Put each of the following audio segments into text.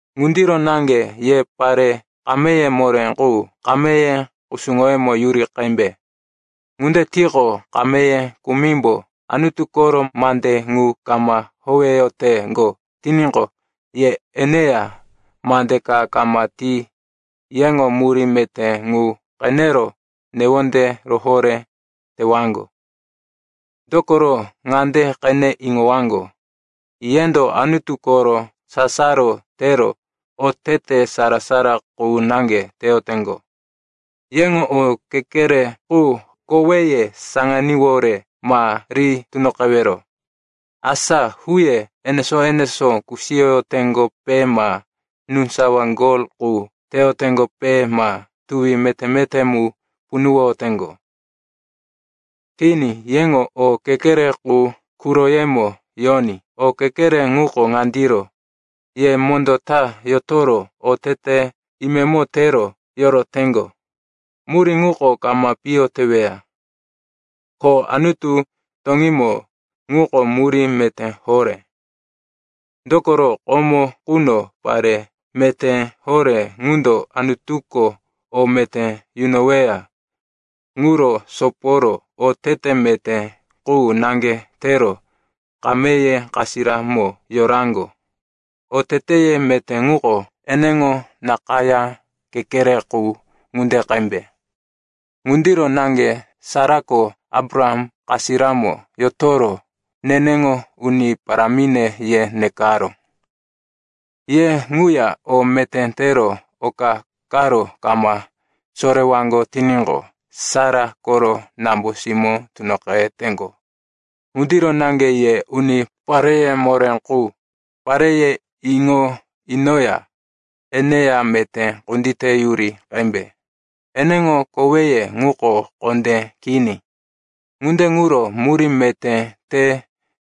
Ŋundiro naŋge, ye pare kameye moré qu, kameye kusuŋoyemo yuri qembe. Ŋunde tiqo, kameye kumimbo Anutu koro mande ŋu kama howeyoteŋgo tiníqo, ye eneya mande ka kama ti yeŋo murí meté ŋu qenero newonde rohoré tewaŋgo. Dokoro ŋande qene iŋowaŋgo, yendo Anutu koro sasaro tero otete sara-sara qu naŋge teyoteŋgo. Yeŋo o kekere qu koweye saŋaníwore ma ri tunoqewero, asa huye enesó-enesó kusiyoyoteŋgope ma núsawa gol qu teyoteŋgope ma tuwi meté-meté mu punuwoyoteŋgo. Kini, yeŋo o kekere qu quroyemo yoní. O kekere ŋuko ŋandiro, ye mondó ta yotoro otete imemo tero yoroteŋgo. Murí ŋuko kama piyo teweya, ko Anutu toŋímo ŋuko murí meté horé. Dokoro komo quno pare meté horé ŋundo Anutuko o meté yunoweya ŋuro soporo otete meté qu naŋge tero kameye kasiramo yoraŋgo. Oteteye meté ŋuko eneŋo nakayá kekere qu ŋunde qembe. Ŋundiro naŋge Sarako Abraham kasiramo yotoro, neneŋo uni parámine, ye nekaró. Ye ŋuya o meté tero oka karo kama sorewaŋgo tiníqo, Sara koro nambo-simó tunoqeteŋgo. Ŋundiro naŋge ye uni pareye moré qu, pareye iŋo inoya eneya meté kunditeyuri qembe. Eneŋo koweye ŋuko kondé kini, ŋunde ŋuro murí meté te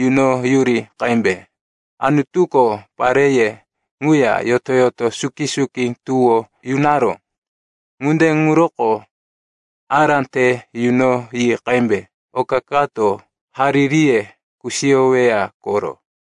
yunoyuri qembe. Anutuko pareye ŋuya yoto-yoto suki-suki tuwó yunaró. Ŋunde ŋuroko ará te yunoyi qembe, oka kato haririye kusiyoweya koro.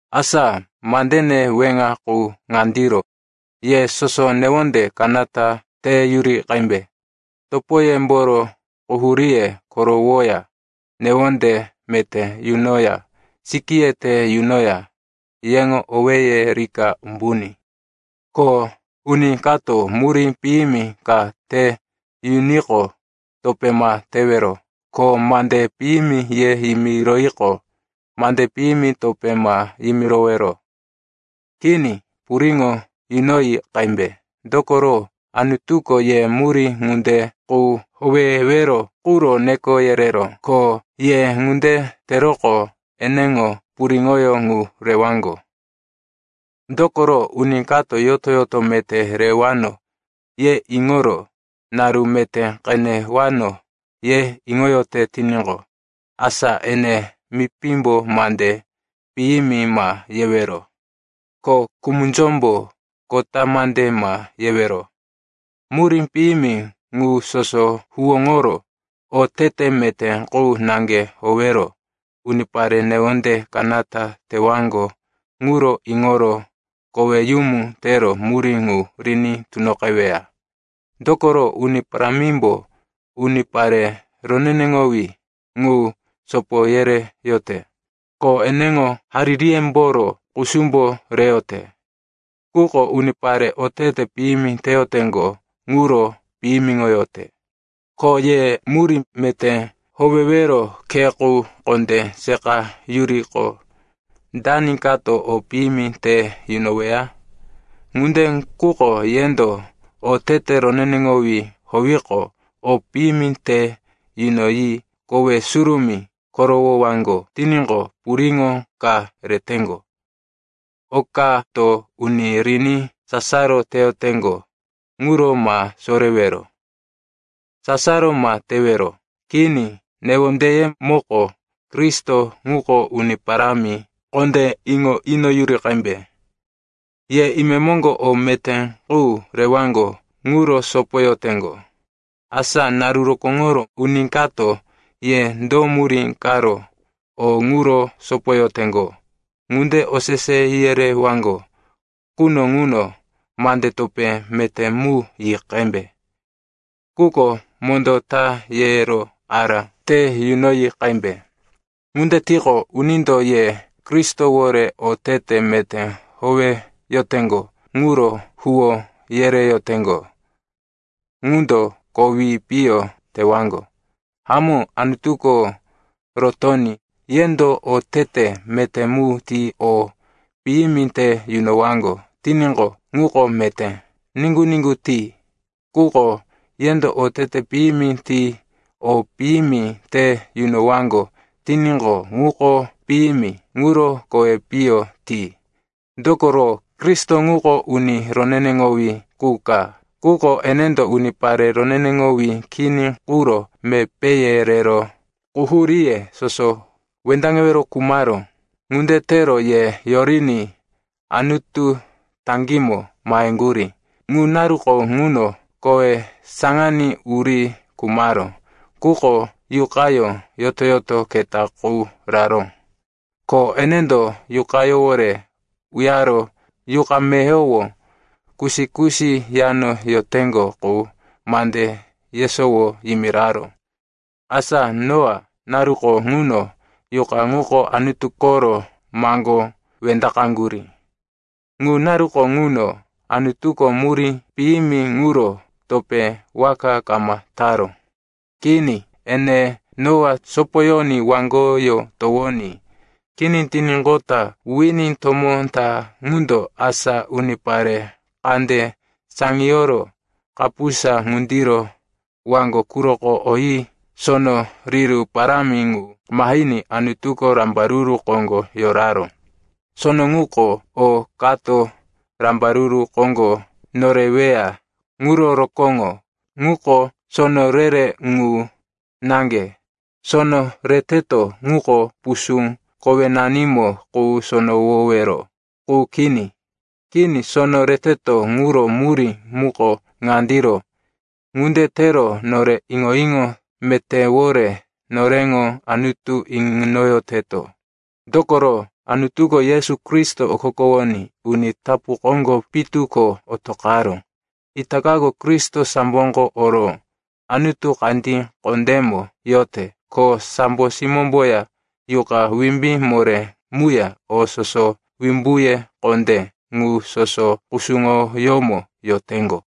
Asa mandene weŋa qu ŋandiro, ye soso newonde kanata teyuri qembe. Topoyemboro quhuríye korowoya, newonde meté yunoya, sikíye te yunoya, yeŋo owéye rika umbuní. Ko uni kato murí piyimi ka te yuniqo, topé ma tewero. Ko mande piyimi ye yimiroyiqo, mande piyimi topé ma yimirowero. Kini, puriŋo yunoyi qembe. Dokoro Anutuko ye murí ŋunde qu howewero quro neko yereró, ko ye ŋunde teroqo eneŋo puriŋoyó ŋu rewaŋgo. Dokoro “uni kato, yoto-yoto meté rewano, ye iŋoro, naru meté qenewano, ye iŋoyote tiníqo, asa ene mipímbo mande piyimi ma yewero ko kumunzómbo kota mande ma yewero, murí piyimi ŋu soso huwóŋoro, otete meté qu naŋge howero, unipare newonde kanata tewaŋgo ŋuro iŋoro koweyumu tero murí ŋu riní tunoqeweya. Dokoro, Uni Parámimbo unipare roneneŋowí ŋu sopo yereyote, ko eneŋo haririyemboro kusumbo reyote. Quko unipare otete piyimi teyoteŋgo ŋuro piyimiŋoyote.” Ko ye murí meté howewero khe qu kondé seqayuriqo, dani kato o piyimi te yunoweya? Ŋunde quko yendo otete roneneŋowí howiqo, o piyimi te yunoyi kowe surumí korowowaŋgo tiníqo, puriŋo ka reteŋgo. “Okato uni riní sasaro teyoteŋgo ŋuro ma sorewero; sasaro ma tewero.” Kini, newondeyemoko, Kristo ŋuko Uni Parámi, kondé iŋo inoyuri qembe. Ye imemoŋgo o meté qu rewaŋgo ŋuro sopoyoteŋgo. Asa naru rokóŋoro uni kato, ye do murí karo o ŋuro sopoyoteŋgo, ŋunde osese yerewaŋgo quno ŋuno mande topé meté mu yi qembe. Quko mondó ta yero ará te yunoyi qembe. Ŋunde tiqo, unindo ye Kristowore otete meté howeyoteŋgo ŋuro huwó yereyoteŋgo ŋundo kowi piyo tewaŋgo. Hamó, Anutuko rotoní yendo otete meté mu ti o piyimi te yunowaŋgo tiníqo, ŋuko meté. Niŋgu-niŋgu ti. Quko yendo otete piyimi ti o piyimi te yunowaŋgo tiníqo, ŋuko piyimi, ŋuro kowi piyo ti. Dokoro Kristo ŋuko uni roneneŋowí qu ka, quko enendo unipare roneneŋowí kini quro mepéye rero quhuríye soso wendaŋewero khumaró. Ŋunde tero ye yoriní Anutu taŋgímo maheŋgurí. Ŋu naruko ŋuno kowí saŋaní uri khumaró, quko Yuqayó yoto-yoto keta qu raró. Ko enendo yuqayówore uyaro yuqa meyowo kusi-kusi yano yoteŋgo qu mande yesowo yimiraró. Asa Noa naruko ŋuno yuqa ŋuko Anutu koro maŋgó wendaqaŋgurí. Ŋu naruko ŋuno, Anutuko murí piyimi ŋuro topé waka kama taró. Kini, ene Noa sopoyoní waŋgoyó towoní kini tiníqota wini tomó ta ŋundo, asa unipare kande saŋiyoro kapusa ŋundiro, waŋgo quroko oyi sono riru parámi ŋu mahiní Anutuko rambaruru koŋgo yoraró. Sono ŋuko o kato rambaruru koŋgo noreweya ŋuro rokóŋo, ŋuko sono re-re ŋu naŋge. Sono reteto ŋuko pusú kowenanimo ŋu sonowowero qu kini. Kini, sono reteto ŋuro murí muko ŋandiro, ŋunde tero nore iŋo-iŋo metéwore noreŋo Anutu inoyoteto, dokoro Anutuko Yesu Kristo okokowoní uni tapu koŋgo pitu ko otoqaró. Itakako Kristo samboko oro Anutu kandí kondémo yote. Ko sambo simómboya yuqa wimbí moré muya o soso wimbuye kondé, ŋu soso kusuŋoyómo yoteŋgo.